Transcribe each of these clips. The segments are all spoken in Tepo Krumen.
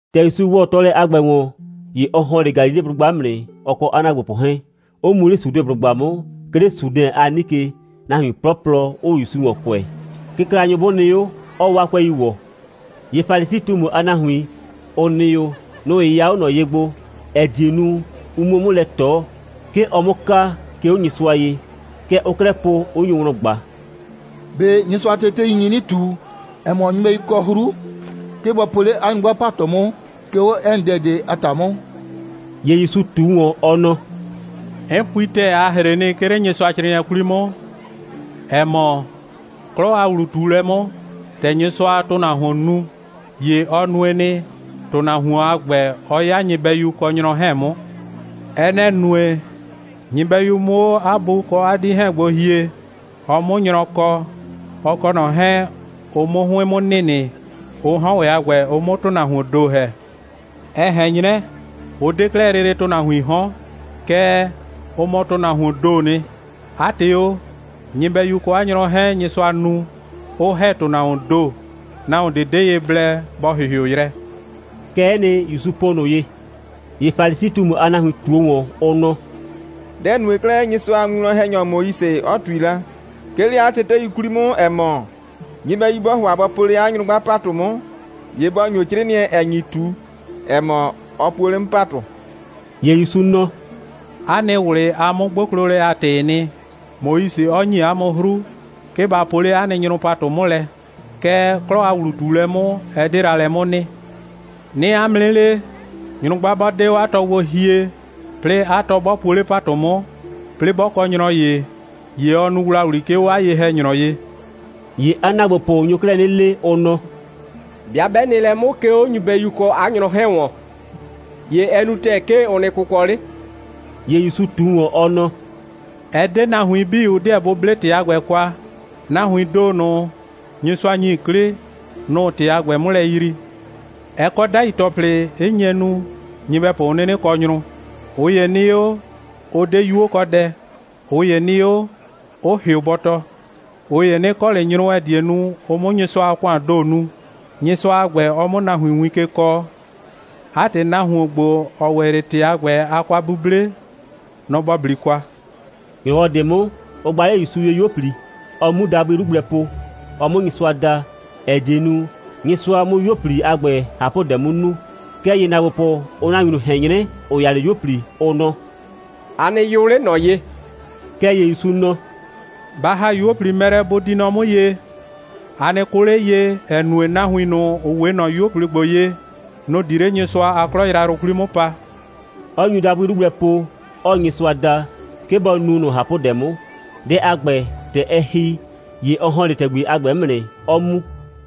‑Tɛ ‑Yusu ‑wɔ tɔɔlɛ a ‑gbɛ ‑wɔn, ‑ye ɔ ‑hɔn 'le Galileblʋgba 'mʋ nɩ, ɔ kɔ 'a ‑naagbopʋ 'hɛɛn, 'ʋ mu 'le Sudeblʋgba 'mʋ, 'ke 'le Sudɛn a 'nike, nahuin 'plɔplɔ 'ʋʋ ‑Yusu ‑wɔn kʋɛ, kɩklanyʋ 'bʋ nɩ 'o, 'ɔɔ 'waa 'kʋɛi ‑wɔ. ‑Ye Falisi꞊tumu a nahuin, ‑ʋ nɩ 'o, nʋ‑ 'yɩya 'o ꞊nɔ ye gbo, ‑ɛ die nu, ʋ 'muo 'mʋ lɛ ꞊tɔ, 'ke ɔ 'mʋ ka, 'ke 'o Nyɩsʋa ye. Kɛ ʋʋ 'klɛɛ po, 'ʋ nyo wlɔn ꞊gba: «꞊Be Nyɩsʋa a tetei, ɩ nyi 'nɩ ꞊tu, ‑ɛ mɔ, nyɩbɛyu kɔ 'hru, 'ke bɔ po 'le 'a nyrʋgba ‑patʋ 'mʋ, 'ke 'o 'ɛ nɩ dɛ ꞊de a ‑ta 'mʋ?» ‑Ye ‑Yusu ꞊tu ‑wɔn, ɔ nɔ: «'N pui ‑tɛɛ, a ‑hre nɩ, 'ke 'le Nyɩsʋacrɩɩnɩɛ 'kwli 'mʋ, ‑ɛ mɔ, 'klɔ a ‑wlu꞊tuulɛ 'mʋ, ‑tɛ Nyɩsʋaa ‑tʋnahuon nu, ‑ye ɔ nue nɩ, ‑tʋnahuon a ‑gbɛ 'ɔ 'ya nyɩbɛyu kɔ nyrɔ 'hɛɛn 'mʋ. Ɛ nɛ‑ nue, nyɩbɛyu 'mʋ 'o 'a bu kɔ 'a 'dii 'hɛɛn gbo hie, ɔ 'mʋ nyrɔ kɔ, ɔ kɔ ꞊nɔ 'hɛɛn, ʋ 'mʋ 'hʋɩn 'mʋ nɩnɩ, ʋ 'hɔn ‑wɛ a ‑gbɛ, ʋ 'mʋ ‑tʋnahuoon ‑do ‑hɛ. Ɛ ꞊hɛn 'nyrɛ, ʋ 'de 'klɛɛ lele ‑tʋnahuiin 'hɔn, kɛɛ, ʋ mɔ ‑tʋnahuoon ‑doo nɩ. 'A ‑tɩ o, nyɩbɛyu kɔ 'a nyrɔ 'hɛɛn, Nyɩsʋa nu, 'ʋ ‑hɛ ‑tʋnahuoon ‑do, nahuon ꞊de 'de ye blɛ, bɔ ‑hɩhɩʋ yrɛ.» Kɛ'ɛ nɩ, ‑Yusu po ꞊nʋ ye. ‑Ye Falisi꞊tumu a nahuin ꞊tuo ‑wɔn, ʋ nɔ: «Dɛ‑ nue 'klɛɛ, Nyɩsʋa a winwlɔn‑hɛnyɔ Moise 'ɔ ꞊tui la, 'ke 'le 'a tetei 'kwli 'mʋ, ‑ɛ mɔ, nyɩbɛyu 'bɔɔ ‑hʋa bɔ po 'le 'a nyrɔ ‑patʋ 'mʋ, ‑ye bɔ ‑nyo 'crɩɩnɩɛ, ‑ɛ nyi ꞊tu, ‑ɛ mɔ, ɔ puo 'le 'mʋ ‑patʋ?» ‑Ye ‑Yusu nɔ: «'A nɩ ꞊wlɩ a 'mʋ'gboklolɛ a ‑tɩɩ nɩ, Moise 'ɔ ‑nyi 'a mʋ 'hru, 'ke ba po 'le 'a nɩ nyrʋ ‑patʋ 'mʋ lɛ. Kɛɛ, 'klɔ a ‑wlu꞊tuulɛ 'mʋ, ɛ 'de la lɛ 'mʋ nɩ. 'Nɩɩ 'a mʋ 'nɩ le, nyrʋgba 'bɔ 'de 'o 'a tɔ gbo hie, 'plɩɩ 'a tɔ 'bɔ puo 'le ‑patʋ 'mʋ, 'plɩɩ 'bɔ kɔ nyrɔ ‑ye, ‑ye ɔ nu ‑wlawli, 'ke 'o 'a ye‑hɛnyrɔ ye.» ‑Ye 'a ‑naagbopʋ nyo 'klɛɛ 'nɩ le, ʋ nɔ: «'Bɩa 'bɛ nɩ lɛ 'mʋ, 'ke 'o nyɩbɛyu kɔ 'a nyrɔ 'hɛɛn ‑wɔn, ‑ye ɛ nu ‑tɛɛ, 'ke ʋ nɩ kʋkɔ 'le.» ‑Ye ‑Yusu ꞊tu ‑wɔn, ɔ nɔ: «Ɛ 'de nahuin 'bii, ʋ 'deɛ bʋ 'ble ‑tɩ a ‑gbɛ kwa. Nahuiin ‑do ꞊nʋ, Nyɩsʋa ‑nyi 'klɩ, nʋ‑ʋ ‑tɩ a ‑gbɛ 'mʋ lɛ yrii. Ɛ kɔ 'dai ‑tɔplɩ, 'ɩ nye nu, nyɩbɛpʋ 'ʋ 'nɩnɩ kɔ nyrʋ: ꞊ʋ ‑ye nɩ 'o, 'ʋ 'de 'yuokɔdɛ, ꞊ʋ ‑ye nɩ 'o, 'ʋ ‑hɩʋ bɔtɔ, ꞊ʋ ‑ye 'nɩ kɔ ꞊le nyrʋ, ‑ɛ die nu, ʋ 'mʋ Nyɩsʋa a ‑kʋaan ‑do nu, Nyɩsʋa a ‑gbɛ, ɔ 'mʋ nahuin win ke kɔɔ. 'A ‑tɩ, nahuon ‑gbo, ‑ɔ ‑wɛ 'le ‑tɩ a ‑gbɛ a kwa'buble, nɔ‑ ‑bɔ 'bli kwa!» ‑Nyrɔwɔ ꞊de 'mʋ, ʋ gba 'le ‑Yusu ye 'yuo꞊pli, ɔ 'mu dabʋɩ 'lu gblɛ po, ɔ 'mʋ Nyɩsʋa da, ‑ɛ die nu, Nyɩsʋa 'mʋ 'yuo꞊pli a ‑gbɛ ꞊hapʋdɛ 'mʋ nu. Kɛɛ ‑ye ‑naagbopʋ, ʋʋ nahuin ꞊nʋ ꞊hɛn 'nyrɛ, ‑ʋ ya 'le 'yuo꞊pli, ʋ nɔ: «A nɩ yʋ 'le ꞊nɔ ye!» Kɛɛ ‑ye ‑Yusu nɔ: «Ba ‑ha 'yuo꞊pli mɛ lɛ, bʋ di nɔ 'mʋ ye. A nɩ kʋ 'le ye, ‑ɛ nue, nahuin ꞊nʋ, ‑ʋ 'we ꞊nɔ 'yuo꞊pli ‑gbo ye, nʋ‑ di 'le Nyɩsʋa a 'klɔ yrayrʋ 'kwli 'mʋ pa,» 'ɔ nyu dabʋɩ 'lu gblɛ po, 'ɔɔ Nyɩsʋa da, 'ke bɔ nu ꞊nʋ ꞊hapʋdɛ 'mʋ. Dɛ a ‑gbɛ, ‑tɛ ɛ ‑hi, ‑ye ɔ ‑hɔn 'le ‑tɛgbi a ‑gbɛ 'mʋ nɩ, 'ɔ mu.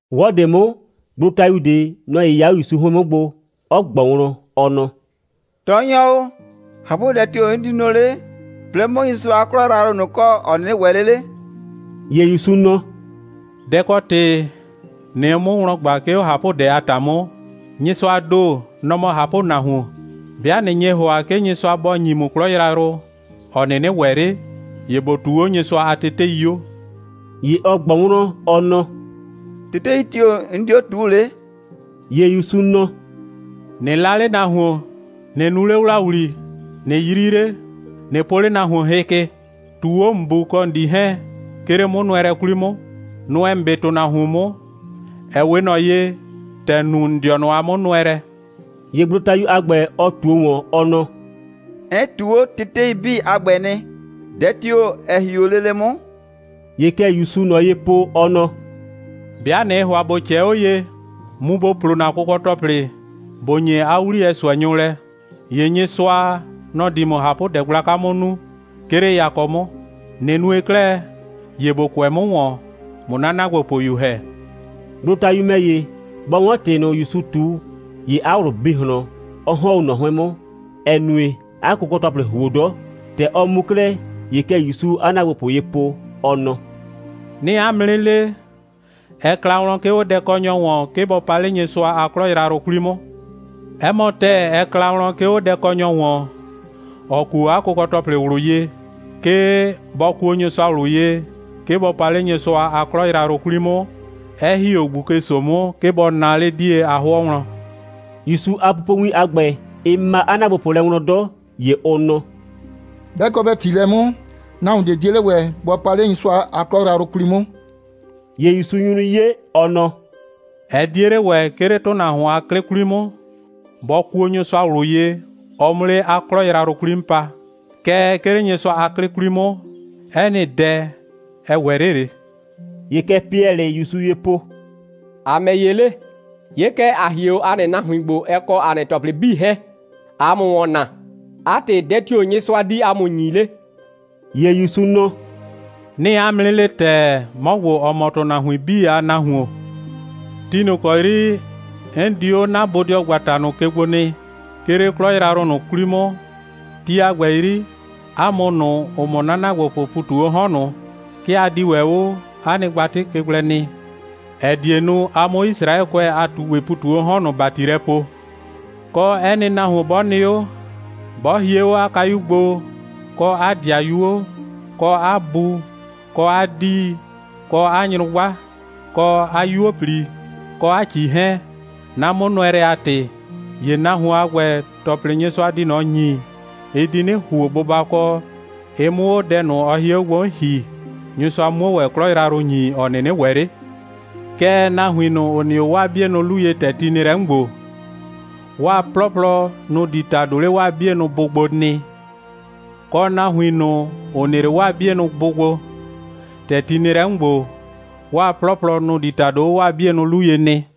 'Wɔ ꞊de 'mʋ, gblotayu ꞊de, nɔ‑ 'yɩya 'o ‑Yusu 'hʋɩn 'mʋ gbo, 'ɔ ꞊gbɔ wlɔn, ɔ nɔ: «Tɔɔnyɔ o, ꞊hapʋdɛ tio‑ 'n di nu 'le, 'plɩɩ 'mʋ Nyɩsʋa a 'klɔ yrayrʋ ꞊nʋ kɔ, ‑ɔ 'nɩnɩ ‑wɛ 'le 'le?» ‑Ye ‑Yusu nɔ: «Dɛ‑ kɔ ‑tɩ ꞊nɩɩ 'mʋ wlɔn ꞊gba, 'ke 'o ꞊hapʋdɛ a ‑ta 'mʋ? Nyɩsʋaa ‑do, nɔ‑ mɔ ꞊hapʋnahuon. 'Bɩa ꞊nɩ nye ‑hʋa, 'ke Nyɩsʋa bɔ ‑nyi ‑mʋ 'klɔ yrayrʋ, ‑ɔ 'nɩnɩ ‑wɛ 'le, ‑ye ‑bo ꞊tuu 'o Nyɩsʋa a tetei 'o!» ‑Ye ɔ ꞊gbɔ wlɔn, ɔ nɔ: «Tetei tio‑ 'n di 'o ꞊tuu 'le?» ‑Ye ‑Yusu nɔ: «꞊Nɩ 'la 'le nahuon, ꞊nɩ nu 'le ‑wlawli, ꞊nɩ 'yri 'le, ꞊nɩ po 'le nahuon hɩ ke, ꞊tuu 'o ‑n bu kɔ ‑n 'dii 'hɛɛn, 'ke 'le 'mʋnʋɛlɛ 'kwli 'mʋ, nʋɛ ‑n 'be ‑tʋnahuon 'mʋ, ‑ɛ 'we ꞊nɔ ye, ‑tɛ ‑n nu ‑n dɩɔnʋ a 'mʋnʋɛlɛ.» ‑Ye gblotayu a ‑gbɛ, ɔ ꞊tuo ‑wɔn, ɔ nɔ: «'N ꞊tuu 'o tetei 'bii a ‑gbɛ nɩ. Dɛ tio‑ ‑ɛ hie 'o lele 'mʋ?» ‑Ye kɛ ‑Yusuu ꞊nɔ ye po, ɔ nɔ: «'Bɩa ꞊nɩɩ ‑hʋa ‑bo ꞊cɛɛ 'o ye, mu ‑bo plo ‑na kʋkɔ‑tɔplɩ, ‑bo ‑nye 'a 'wliyɛ ꞊sʋɛnyʋ lɛ, ‑ye Nyɩsʋa, nɔ‑ di ‑mʋ ꞊hapʋdɛ gblaka 'mʋ nu, 'ke 'le yakɔ 'mʋ. ꞊Nɩ nue 'klɛɛ, ‑ye ‑bo kʋɛ 'mʋ ‑wɔn, ꞊mʋ 'na ‑naagbopʋyu ‑hɛ.» Gblotayu ‑mɛ ‑ye, bɔ 'wɔn ‑tɩ ꞊nʋ ‑Yusu ꞊tu, ‑ye 'a ꞊wlʋ bi ꞊hlɔn, 'ɔ ‑hɔn 'o ꞊nɔ 'hʋɩn 'mʋ, ‑ɛ nue, 'a kʋkɔ‑tɔplɩ ‑huo 'dɔ. ‑Tɛ ɔ mu 'klɛɛ, ‑ye kɛ ‑Yusuu 'a ‑naagbopʋ ye po, ɔ nɔ: «'Nɩɩ 'a mʋ 'nɩ le, ɛ kla wlɔn, 'ke 'o dɛkɔnyɔ ‑wɔn, 'ke bɔ pa 'le Nyɩsʋa a 'klɔ yrayrʋ 'kwli 'mʋ. 'Ɛ mɔ ‑tɛɛ, ɛ kla wlɔn, 'ke 'o dɛkɔnyɔ ‑wɔn, ‑ɔ kuo 'a kʋkɔ‑tɔplɩ ꞊wlʋ ye, 'ke bɔ kuo Nyɩsʋa ꞊wlʋ ye, 'ke bɔ pa 'le Nyɩsʋa a 'klɔ yrayrʋ 'kwli 'mʋ, 'ɛ ‑hi 'o ꞊gbuke‑so 'mʋ, 'ke bɔ naa 'le 'die a 'hʋɔ wlɔn.» ‑Yusu a pupowin a ‑gbɛ, ɩ ma 'a ‑naagbopʋ lɛ wlɔn 'dɔ. ‑Ye ʋ nɔ: «'Bɛ kɔ bɛ ‑ti lɛ 'mʋ, nahuon ꞊de 'die 'le ‑wɛ bɔ pa 'le Nyɩsʋa a 'klɔ yrayrʋ 'kwli 'mʋ.» ‑Ye ‑Yusu nyu 'nɩ 'ye, ɔ nɔ: «Ɛ 'die 'le ‑wɛ, 'ke 'le ‑tʋnahuon a 'klɩ 'kwli 'mʋ, bɔ kuo Nyɩsʋa ꞊wlʋ ye, ɔ 'mʋ 'le 'a 'klɔ yrayrʋ 'kwli 'mʋ pa. Kɛɛ, 'ke 'le Nyɩsʋa a 'klɩ 'kwli 'mʋ, 'ɛ nɩ dɛ, ɛ ‑wɛ 'le ꞊le.» ‑Ye kɛ Piɛlɩɩ ‑Yusu ye po: «‑A ‑mɛ ‑ye 'le? 'Ye kɛ, ‑a hie 'o ‑a nɩ nahuin gbo, ɛ kɔ ‑a nɩ ‑tɔplɩ 'bii 'hɛɛn, ꞊aa ‑mʋ ‑wɔn naa. 'A ‑tɩ, dɛ tio‑ Nyɩsʋa di ‑a mʋ ‑nyi 'le?» ‑Ye ‑Yusu nɔ: «'Nɩɩ 'a mʋ 'nɩ le ‑tɛɛ, 'mɔ ‑gbo, ‑ɔ mɔ ‑tʋnahuin 'bii a Nahuon, ti ꞊nʋ ‑kɔ 'yri, 'n di 'o 'na bodɩɔgbata ꞊nʋ ke gbo nɩ, 'ke 'le 'klɔ yrayrʋ ꞊nʋ 'kwli 'mʋ, ti a ‑gbɛ 'yri, 'a mʋ ꞊nʋ, ‑ʋ mɔ 'na ‑naagbopʋʋ ‑pu ꞊tu 'o 'hɔn ꞊nʋ, 'ke a di ‑wɛ 'o 'a nɩ gbatɩ ke gblɛ nɩ, ‑ɛ die nu, a 'mʋ Yisraɛkʋɛ a ꞊tugbɩ ‑pu ꞊tu 'o 'hɔn ꞊nʋ ‑bati lɛ poo. Kɔ, 'ɛ nɩ nahuon 'bɔ nɩ 'o, 'bɔ hie 'o 'a kayuo gbo, kɔ 'a ‑dɩayuo, kɔ 'a bu kɔ 'a 'dii, kɔ 'a nyrʋgba, kɔ 'a 'yuo꞊pli, kɔ 'a ‑cii 'hɛɛn, 'na 'mʋnʋɛlɛ a ‑tɩ, ‑ye nahuon a ‑gbɛ, ‑tɔplɩ, Nyɩsʋa di ꞊nɔ ‑nyi, ɩ di 'nɩ ‑huo bʋbakɔ, ɩ 'mʋ 'o dɛ ꞊nʋ, ɔ hie 'o gbo 'mʋ ‑hi, Nyɩsʋa 'muo ‑wɛ 'klɔ yrayrʋ ‑nyi, ‑ɔ 'nɩnɩ ‑wɛ 'le. Kɛɛ, nahuin ꞊nʋ, ‑ʋ nɩ 'o 'waa 'bienʋ 'lu ye, ‑tɛ ti nɩ lɛ 'mʋ ‑gbo, 'waa 'plɔplɔ, nʋ‑ di ‑tado 'le 'waa 'bienʋ bʋ gbo nɩ, kɔ, nahuin ꞊nʋ, ‑ʋ nɩ 'le 'waa 'bienʋ bʋ gbo, ‑tɛ ti nɩ lɛ 'mʋ ‑gbo, 'waa 'plɔplɔ, nʋ‑ di ‑tado 'o 'waa 'bienʋ 'lu ye nɩ.»